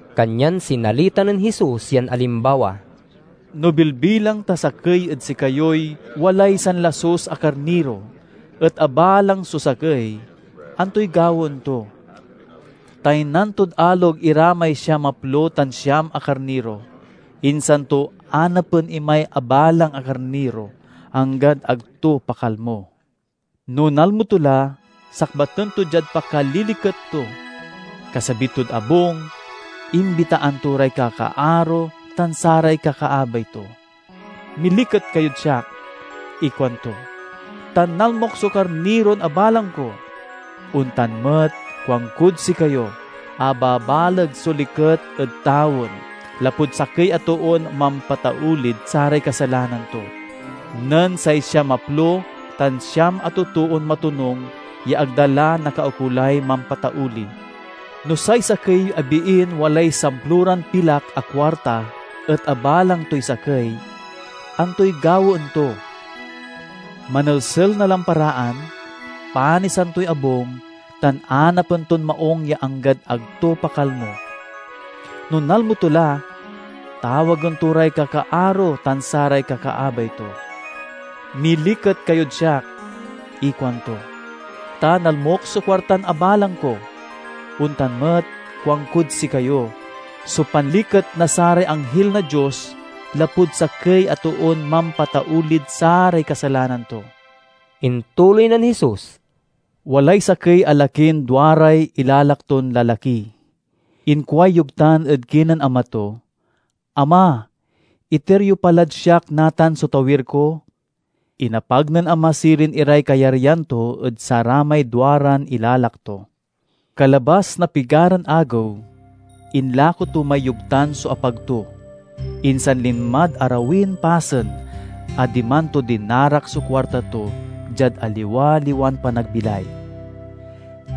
Kanyan sinalita nen Jesus yan alimbawa, "No bilbilang ta sakey ed sikayoy walay sanlasus a karniro et abalang so sakey, antoy gawaen to? Taynan tod alog ira may siamaplo tan siam a karniro, insan to anapen imay abalang a karniro, anggad ag to pakalmo. No nalmo to la, sakbaten to diad pakaliliket to. Kasabi tod abung, imbitaan to ray kakaaro tan saray kakaabay to. 'Miliket kayod siak,' ikuanto, 'ta nalmok so karniron abalang ko!' Ontan met, kuankod sikayo, a babaleg so liket ed tawen lapud sakey a toon mampataulid saray kasalanan to, nen say siamaplo tan siam a totoon matonung ya ag da la nakaukolay mampatauli." "No say sakey a biin walay samploran pilak a kuarta et abalang toy sakey, antoy gawaen to? Manelsel na lamparaan, panisan toy abung, tan anapen ton maung ya anggad ag to pakalmo. No nalmo to la, tawagen to ray kakaaro tan saray kakaabay to. 'Miliket kayod siak,' ikuanto, 'ta nalmok so kuartan abalang ko!' Ontan met, kuankod sikayo, so panliket na saray anghil na Dios lapud sakey a toon mampataulid saray kasalanan to." Intuloy nen Jesus, "Walay sakey a lakin duaray ilalak ton lalaki. Inkuay yogtan ed kinen ama to, 'Ama, iter yo pa lad siak natan so tawir ko.' Inapag nen ama sirin iray kayaryan to ed saramay duaran ilalak to. Kalabas na pigaran agew, inlako to may yogtan so apag to, insan linmad arawin pasen a diman to dinarak so kuarta to diad aliwaliwan panagbilay.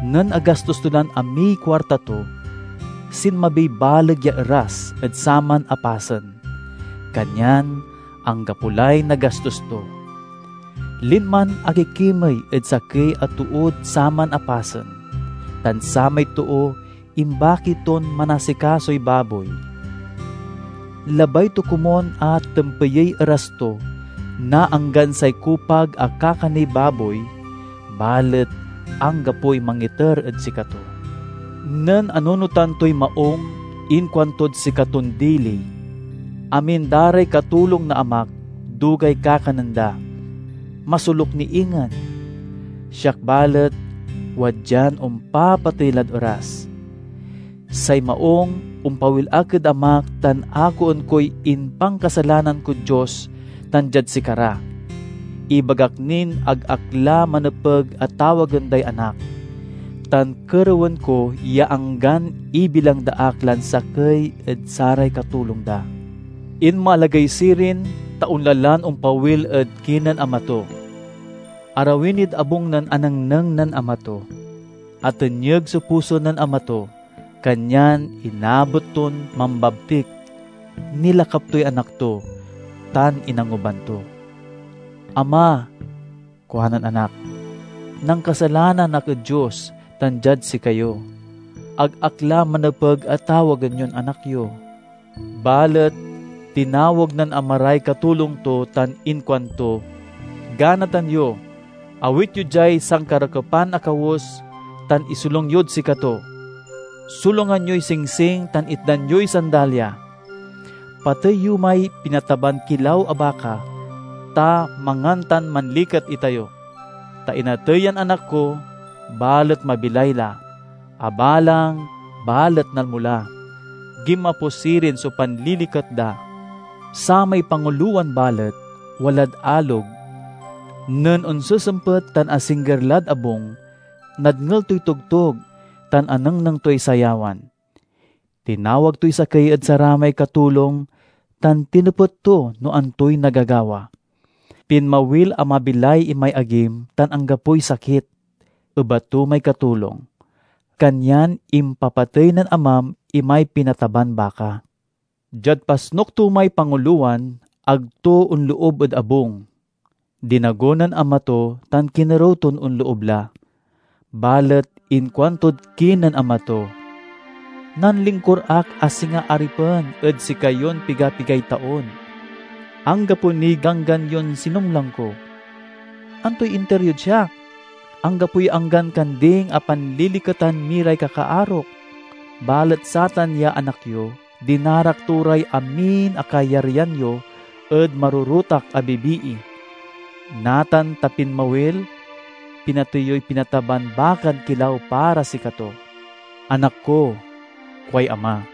Nen agastos to lan amiy kuarta to, sinmabiy baleg ya eras ed saman a pasen, kanyan anggapo lay nagastos to. Linman akikimey ed sakey a tood saman a pasen, tan samay too imbaki ton manasikasoy baboy. Labay to komun a tempeyey eras to na anggan say kupag a kakaney baboy, balet anggapoy mangiter ed sikato. Nen anunotan toy maung inkuantod sikaton dili, 'Amin da ray katulong na amak dugay kakanen da. Masoluk ni ingen! Siak, balet, wadyan ompapatey lad eras. Say maung, ompawil ak ed amak tan akoen koy impankasalanan kod Dios tan diad sikara. Ibagak nin ag ak la manepeg a tawagen day anak, tan kerewen ko ya anggan ibilang da ak lan sakey ed saray katulong da.' Inmalagey sirin, ta onla lan ompawil ed kinen ama to. "Arawi nid abung nen anengneng nen ama to. Atenyeg so puso nen ama to, kanyan inabet ton mambabtik, nilakap toy anak to, tan inanguban to. 'Ama,' kuanen anak, 'nankasalanan ak ed Dios tan diad sikayo. Ag ak la manepeg a tawagen yon anak yo.' Balet tinawag nen ama ray katulong to tan inkuanto, 'Ganatan yo! Awit yo diay sankarakepan a kawes tan isolung yod sikato. Solungan yoy singsing tan itdan yoy sandalya. Patey yo may pinataban kilaw a baka, ta mangan tan manliket itayo! Ta inatey yan anak ko, balet mabilay la; abalang, balet nalmo la.' Ginmapo sirin so panliliket da. "Samay pangulowan balet, walad alog. Nen onsesempet tan asingger lad abung, nadngel toy togtog tan anengneng toy sayawan. Tinawag toy sakey ed saramay katulong tan tinepet to no antoy nagagawa. 'Pinmawil a mabilay imay agim tan anggapoy sakit,' ebat to may katulong, 'kanyan impapatey nen amam imay pinataban baka.' Diad pasnuk to may pangulowan, ag to onloob ed abung. Dinago nen ama to tan kinerew ton onloob la. Balet inkuantod kinen ama to, 'Nanlingkur ak a singa aripen ed sikayon piga-pigay taon. Anggapo niy ganggan yon sinumlang ko. Antoy inter yod siak? Anggapoy anggan kanding a panliliketan mi ray kakaarok! Balet satan ya anak yo, dinarak to ray amin a kayaryan yo ed marorotak a bibii. Natan ta pinmawil, pinatey yoy pinataban bakan kilaw para sikato!' 'Anak ko,' kuay ama,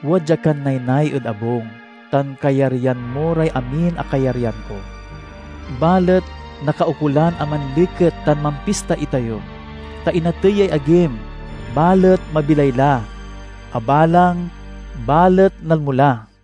'wadya kan naynay ed abung tan kayaryan mo ray amin a kayaryan ko. Balet nakaukolan a manliket tan mampista itayo, ta inatey yay agim, balet mabilay la; abalang, balet nalmo la!'"